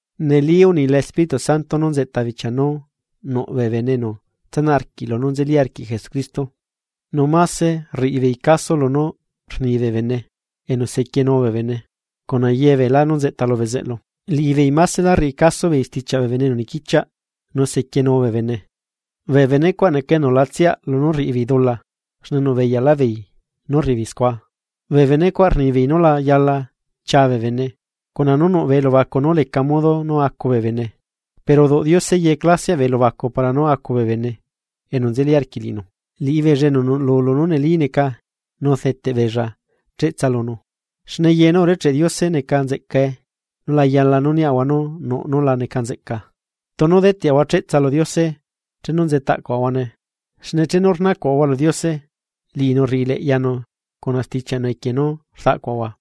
Neli unila Espíritu Santo nú nzeꞌta bichia nú nuꞌ bee bene enu tsanaꞌ arquiꞌ lunú nzeli arquiꞌ Jesucristo, nu máse rriꞌi beei caso lunú rni bee bene enu sequienu bee bene cuna ye beelá nú nzeꞌta lu bezeꞌlu. Liꞌibeei maselá rriꞌi caso beei stichiaꞌ bee bene enu niquichiaꞌ nu sequienu bee bene, bee benecuaꞌ neca enu la tsiaꞌ lunú rriꞌi beei dula xne nuꞌbeyaꞌlaꞌ beei nú rriꞌibeei scua. Bee benecuaꞌ rnibeei nú la yala chia bee bene, cuna nú nuꞌ bee elubacu nú leca modo nú acu bee bene, pero uduꞌ Diose ye clasiaꞌ bee elubacu para nú acu bee bene enu nzeli arquiꞌ liꞌinu, liꞌibeella enu nuꞌlu lunú neli neca nu deteꞌbeella cheꞌtsa lunu. Xne ye nú urecheꞌe Diose neca nzeꞌcae, nu la yala nú niꞌahua nú nuꞌ nú la neca nzeꞌca, tunu deteꞌahua cheꞌtsa lu Diose chenu nzetaꞌcuaꞌahuane, xne chenu rnacuaꞌahua lu Diose, liꞌinu rriꞌileꞌyanu cuna stichiaꞌnu equie nú rdaꞌcuaꞌahua.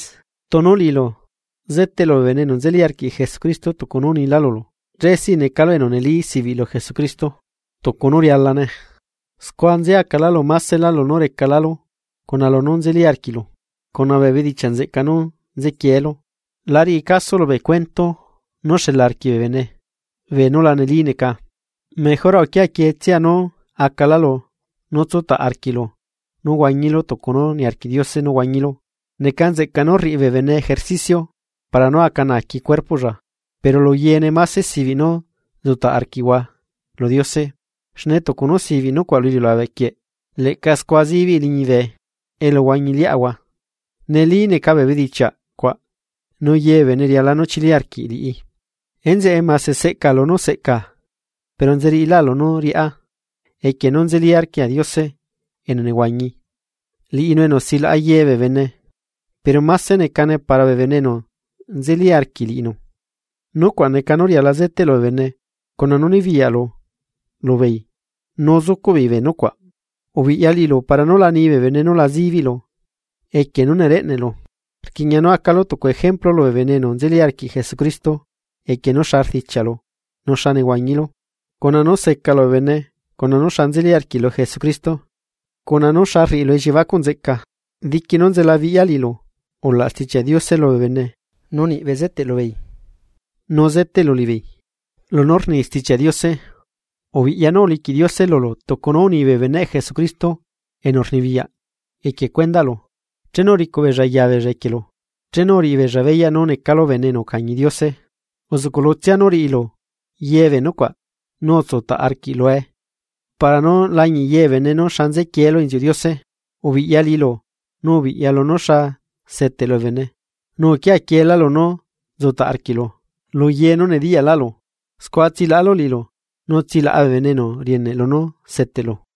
Tunu liꞌilu seteꞌlu bee bene enu nzeli arquiꞌ Jesucristo tucu nú unilá lulu, che sí necalu enu neli sibiꞌ lu Jesucristo tucu nú rialane, scua nzeacalálu maselá lunú recalalu cuna lunú nzeli arquiꞌlu, cuna bee bedichiaꞌ nzeꞌca nú nzequieelu. La riꞌilu caso bee cuento nú xela arquiꞌ bee bene beenú la neli neca, mejora uquia quietsia nú acalálu nú tsutaꞌ arquiꞌlu nú huañilu tucu nú niarquiꞌ Diose nú huañilu. Neca nzeꞌca nú rriꞌi bee bene ejercicio para nú aca naaqui cuerpoꞌlla, pero lu yeene máse sibiꞌ nú nzutaꞌ arquiaꞌahua lu Diose, xne tucu nú sibiꞌ nucuaꞌ lu iliulabe quieꞌ leꞌca scua zibiꞌi liñibe elu huañi liꞌahua. Neli neca bee bedichiaꞌ cuaꞌ, nu ye bee bene riala nú chili arquiꞌ liꞌi. Enzeꞌe mase seꞌcaꞌa lunú seꞌcaꞌa, pero nzeriꞌilá lunú riꞌá, equie nú nzeli arquiaꞌa Diose enu nehuañi, liꞌinu enu silaꞌa ye bee bene. Pero máse necane para bee bene enu nzeli arquiꞌ liꞌinu. Nucuaꞌ neca nú riala zeteꞌlu bee bene cuna nu nibiyaꞌlu lubeei nú zucuꞌ beei bee nucuaꞌ. Ubiꞌya liꞌilu para nú la ni bee bene nu la zibiꞌlu equie nú nereꞌneꞌlu, rquiꞌña nú acalu tucu ejemplu lubee bene enu nzeli arquiꞌ Jesucristo equie nú xa rdichiaꞌlu nu xa nehuañilu, cuna nú secalu bee bene cuna nu xa nzeli arquiꞌlu Jesucristo, cuna nú xa rriꞌilu elliebacuꞌ nzeꞌca. Diqui nú nzelabiꞌya liꞌilu ulaꞌ Stichiaꞌ Diose lubee bene, nu niꞌ bezeteꞌ lubeei nu zeteꞌlu liꞌibeei lunú rni Stichiaꞌ Diose. Ubiꞌya nú uliquiꞌ Diose lulu tucu nú uni bee beneꞌ Jesucristo enu rnibiyaꞌ equie cuendaꞌlu chenu uricuꞌ beella yabeella equielu, chenu uriꞌi beella beyaꞌ nú necalu bene enu ucañi Diose. Uzuꞌcuꞌlutsia nú riꞌilu ye bee nucuaꞌ nu utsutaꞌ arquiꞌ lue para nú lañiꞌ ye bee bene nú xa nzequielu inziuꞌ Diose. Ubiꞌya liꞌilu nu ubiꞌya lunú xa seteꞌlu bee bene, nu uquia quieelá lunú nzutaꞌ arquiꞌlu lu ye nu nediyaꞌlaꞌlu, scua tsilaꞌalu liꞌilu nu tsilaꞌa bee bene enu rieneꞌ lunú seteꞌlu.